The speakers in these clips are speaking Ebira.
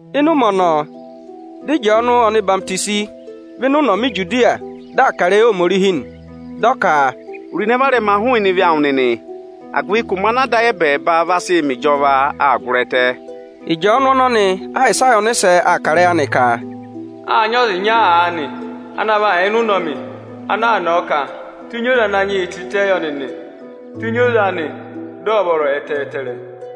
Ịnị ụmẹ ọnọọ, dị Ịjọọnụ ọhwọzenyi vẹ ịnị ụnọmị Ijudiya, dị aa kà ịrẹyị Ohomorihi nị. Dị ọ ka: aza è ro ịnẹ varẹma hụụnị ebira odivi ẹnịnị, agụvị ka ụmẹ ọnị Ada ayị ẹbẹẹba vaa sị mẹ ịjọva aa gụrị ẹtẹ nị. Ịjọọnụ ọnọnị Ayịsaya ọnịsẹ aa kà ịrẹyị anị ka: Â nyị ọza ịnya aanị ana va yà ịnị ụnọmị aa nọ̀ọ ka: Tenyi oze Ananyị yị tịtẹ yọ nịnị, tenyi oze anị, dị ọ̀ vọrọ ẹtẹẹtẹrẹ.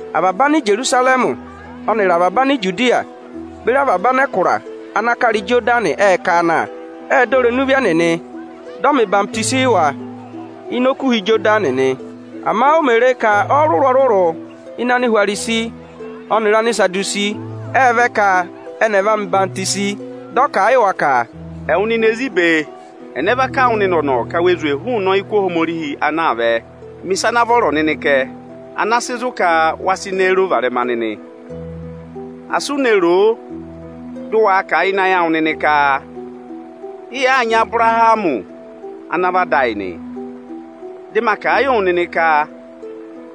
Avaba Anijerusarẹmị ẹnịrị avaba Anijudiya beri avaba anẹkụra ana kara Ijodani ệ ká a na. Ệ dọ irenu ebira odivi ẹnịnị, dị ọ́ mẹ̀ ọyịhwọzenyi yị wa ịnị Okuha Ịjọdanị nị. Ama òo mè re ka ọrụrụ-ọrụrụ ịnị Anihwarisi ẹnịrị Anisadusi nịnị ệ vẹ ka à mẹ̀ ọyịhwọzenyi yị ẹnị, dị ọ kà a yị wa ka, “Ẹwụ nịnị ezi ibe, ẹnẹ va kà wụ nịnị ọ̀nọ̀ ka we zwè yị ọyịkụ Ohomorihi anaa vẹ? Mẹ ịsa ana vọrọ kẹ, ana vaa sị zụ ka we reè ro ịnẹ varẹma nịnị. Asị u ne roo, dị ụ waa kà a ịnị ayị awụ nịnị ka, ‘Ị yàaa nyị Abụrahamị ana vị ada ayị nị.’ Dị ma kà a yị wụ nịnị ka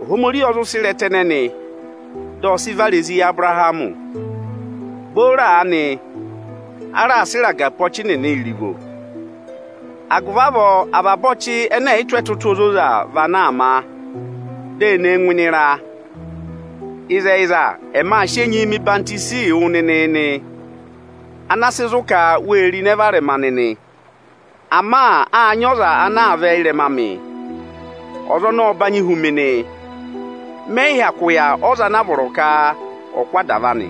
Ohomorihi ọ zụ sị ịrẹta ẹnẹnị dị ọ sị vara ezi yị Abụrahamị Booro aanị, á raa sị ịraga pe ọchị nịnị ẹpa, avaba ọchị ẹnẹ ẹ̀ yị tụ́ ẹtụtụ ozoza vị ana á vaa má, dị e ne e ngụ ịnị ịra. Ịzẹyịza, ẹmị aa sị enyi hụ́ wụ nịnị enyi ana sị zụ ka we reè ro ịnẹ varẹma nịnị. Ama áa nyị ọza anaa vẹ ịrẹma amị. Ọza ọnọọ ọ nyị ụkata huna amị nị. Mẹ yị hyakụ yà ọza ana á vọrọ ka ọ̀ kụ́ adava anị.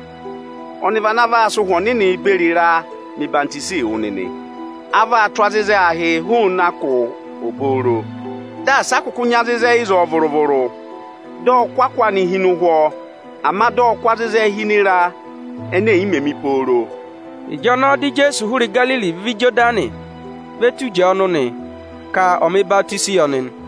Ọza ọnọọ vị ana vaa sị Ụhwẹ Ọnịnị beri ịraa hụ́ wụ nịnị enyi. Ọ vaa tụ́ azịzẹ ahịị hụụnị akụ obooro, dị a si a kụkụ nyị azịzẹ ịzọọ vụrụ-vụrụ. Dị ọ kụ́ akụ anị hi ịhị ụhwọ; ama dị ọ kụ azịzẹ hi ịnị ịra ene è yi mē mi pooro”. Ịnị ụmẹ ọnọọ Ijeesu ộ hụrị Igariri vẹ Ijodani ve tu Ịjọọnụ kà ọ̀ hụ́ ọnị enyi.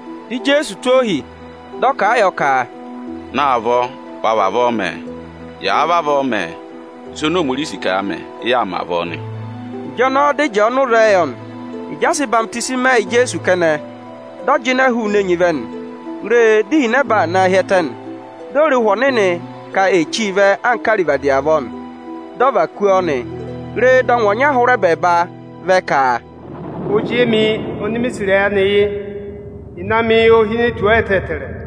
Dị Ijeesu tụ́ ohi, dị ọ́ kà a yọ ka, “Naavọ wa vavọọ mẹ ẹ! Yàa vavọọ mẹ, ịsa ọnị Ohomorihi si ka ya mẹ̀, ị yaa mẹ avọọ nị”. Ịjọnọọ dị Ịjọọnụ zẹẹ yọ nị. Ịjị a sị ọyịhwenyi mẹ yị Ijeesu kẹnẹ, dị ọ jịnẹ hụụnị enyi vẹ nị. Re, dị ihinẹba na hi ẹtẹ, dị o re ka Ụhwẹ Ọnịnị Ohomorihi anka arivadi avọọ, dị ọ và kú ọ nị. Re, dị ọngwẹ ọnya hụrị ẹbẹẹba vẹ ka, “Ozi emi oni mi sì ịrẹyị anị yị, ịnẹ amị ô hine tù ọ ẹtẹẹtẹrẹ”.